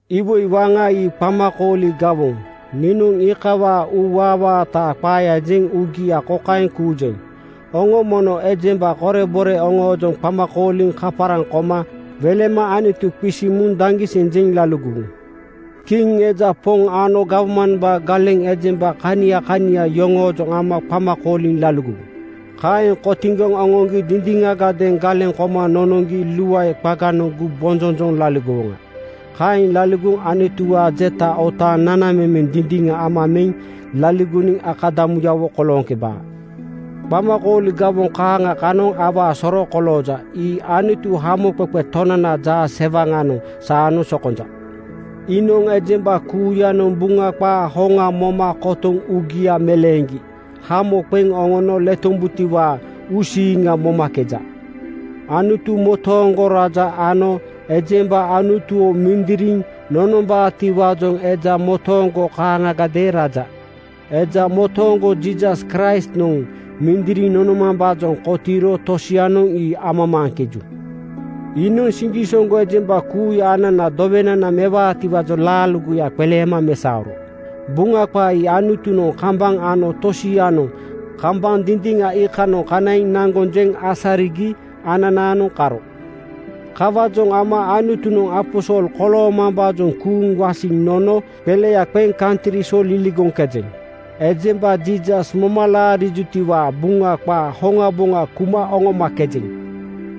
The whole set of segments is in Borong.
Iwoi waŋa ii qamakooli gawoŋ. Niinoŋ iikawaa uuwaawaataa qaaya jeŋ uugia kokaeŋ kuujeŋ: Oŋo mono ejemba korebore oŋoojoŋ qama kooliŋ kaparaŋ koma welema Anutu qisiŋ muŋ daŋgiseŋ jeŋ laligowu. Kiŋ eja poŋ ano gawmambaa galeŋ ejemba kania kania yoŋoojoŋ ama qama kooliŋ laligowu. Kaeŋ kotiŋgoŋ oŋoŋgi dindiŋagadeeŋ galeŋ koma nonoŋgi luae qaganoŋ gumbonjonjoŋ laligowoŋa. Kaeŋ laligoŋ Anutuwaa jeta otaaŋ nanamemeŋ dindiŋa ama meŋ laligoniŋ akadamuyawo kolooŋkebaa. Qamakooli gawoŋ kaaŋa kanoŋ awaa soro kolooja. Ii Anutu, Hamoqeqe Tonanaa jaasewaŋanoŋ saanoŋ sokonja. Iinoŋ ejemba kuuyanoŋ Buŋa qaa hoŋa moma kotoŋ uugia meleeŋgi hamo qeŋ oŋono letombutiwaa uusiiŋa momakeja. Anutu motooŋgo raja ano ejemba Anutuwo mindiriŋ nonombaatiwaajoŋ eja motooŋgo kaaŋagadeeŋ raja. Eja motooŋgo Jiisas Kraistnoŋ mindiriŋ nonomambaajoŋ kotiiro tosianoŋ ii amamaaŋkeju. Iinoŋ siŋgisoŋgo ejemba kuuya ananaa dowenana mewaatiwaajoŋ laaligoya qeleema mesaoro. Buŋa qaa ii Anutunoŋ kambaŋ ano tosianoŋ kambaŋ dindiŋa iikanoŋ kanaiŋ naŋgoŋ jeŋ asarigi ananaanoŋ karo. Kawaajoŋ ama Anutunoŋ aposol koloomam-baajoŋ kuuŋ wasiŋ nono qeleya qeŋ kantri so liligoŋkejeŋ. Ejemba Jiisas moma laariwutiwaa Buŋa qaa hoŋaboŋa kuma oŋomakejeŋ.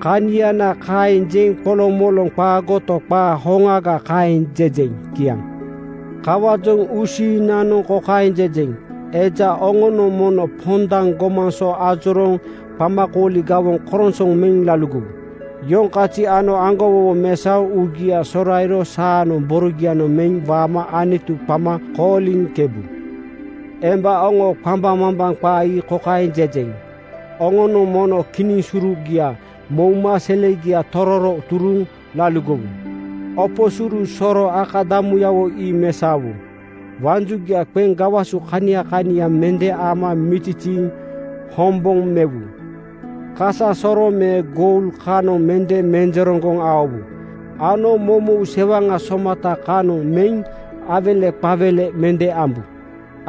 Kaniana kaeŋ jeŋ qolomoloŋ qaagoto, qaa hoŋaga kaeŋ jejeŋ. Kiaŋ. Kawaajoŋ uusiiŋnanoŋ kokaeŋ jejeŋ: Eja oŋonoŋ mono pondaŋ gomaŋ so ajorooŋ qamakooli gawoŋ koronsoŋ meŋ laligowu. Yoŋ kazi ano aŋgowowo mesaoŋ uugia sorairo saanoŋ borogianoŋ meŋ waama Anutu qama kooliŋkebu. Emba oŋoo qambaŋmambaŋ qaa ii kokaeŋ jejeŋ: Oŋonoŋ mono kinisurugia mouma selegia tororo turuŋ laligowu. Opo suru soro akadamuyawo ii mesaowu. Waŋ jugia qeŋ gawasu kania kania mende ama miziziiŋ hoŋboŋ mewu. Kasasoroŋ me goul kanoŋ mende menjereŋgoŋ aowu ano moumou sewaŋa somata kanoŋ meŋ aiweleqaiwele mende ambu.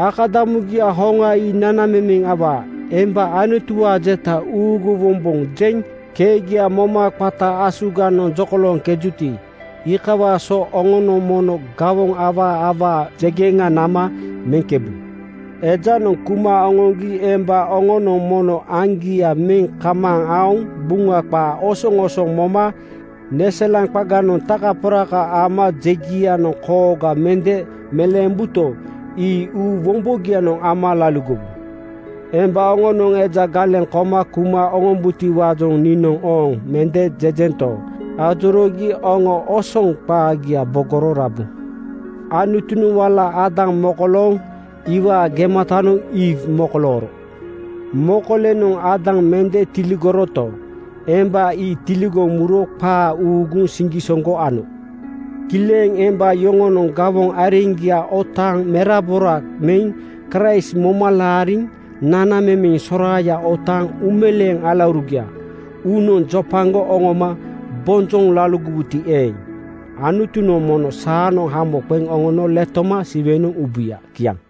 Akadamugia hoŋa ii nanamemeŋ awaa. Emba Anutuwaa jeta uuguwombojeŋ keegia moma qata asuganoŋ jokolooŋkejuti, iikawaa so oŋonoŋ mono gawoŋ awaa awaa jegeŋa nama meŋkebu. Ejanoŋ kuma oŋoŋgi emba oŋonoŋ mono aŋgia meŋ kamaaŋ aoŋ Buŋa qaa osoŋosoŋ moma neselaŋ qaganoŋ takaporaka ama jegianoŋ kooga mende meleembuto, ii uu wombogianoŋ ama laligowu. Emba oŋonoŋ eja galeŋ koma kuma oŋombutiwaajoŋ niinoŋ ‘Ooŋ!’ mende jejento, ajoroogi oŋo osoŋ qaagia bogoro rabu. Anutunoŋ wala Aadam mokolooŋ iwaa gematanoŋ Iiw (Eewa) mokolooro. Mokolenoŋ Aadam mende tiligoroto, emba ii tiligoŋ muro qaa uuguŋ siŋgisoŋgo ano. Kileŋ emba yoŋonoŋ gawoŋ areŋgia otaaŋ merabora meŋ Kraist moma laariŋ nanamemeŋ soraaya otaaŋ uumeleeŋ alaurugia uunoŋ jopagoŋ oŋoma bonjoŋ laligowuti eeŋ, Anutunoŋ mono saanoŋ hamo qeŋ oŋono letoma Siwenoŋ ubuya. Kiaŋ.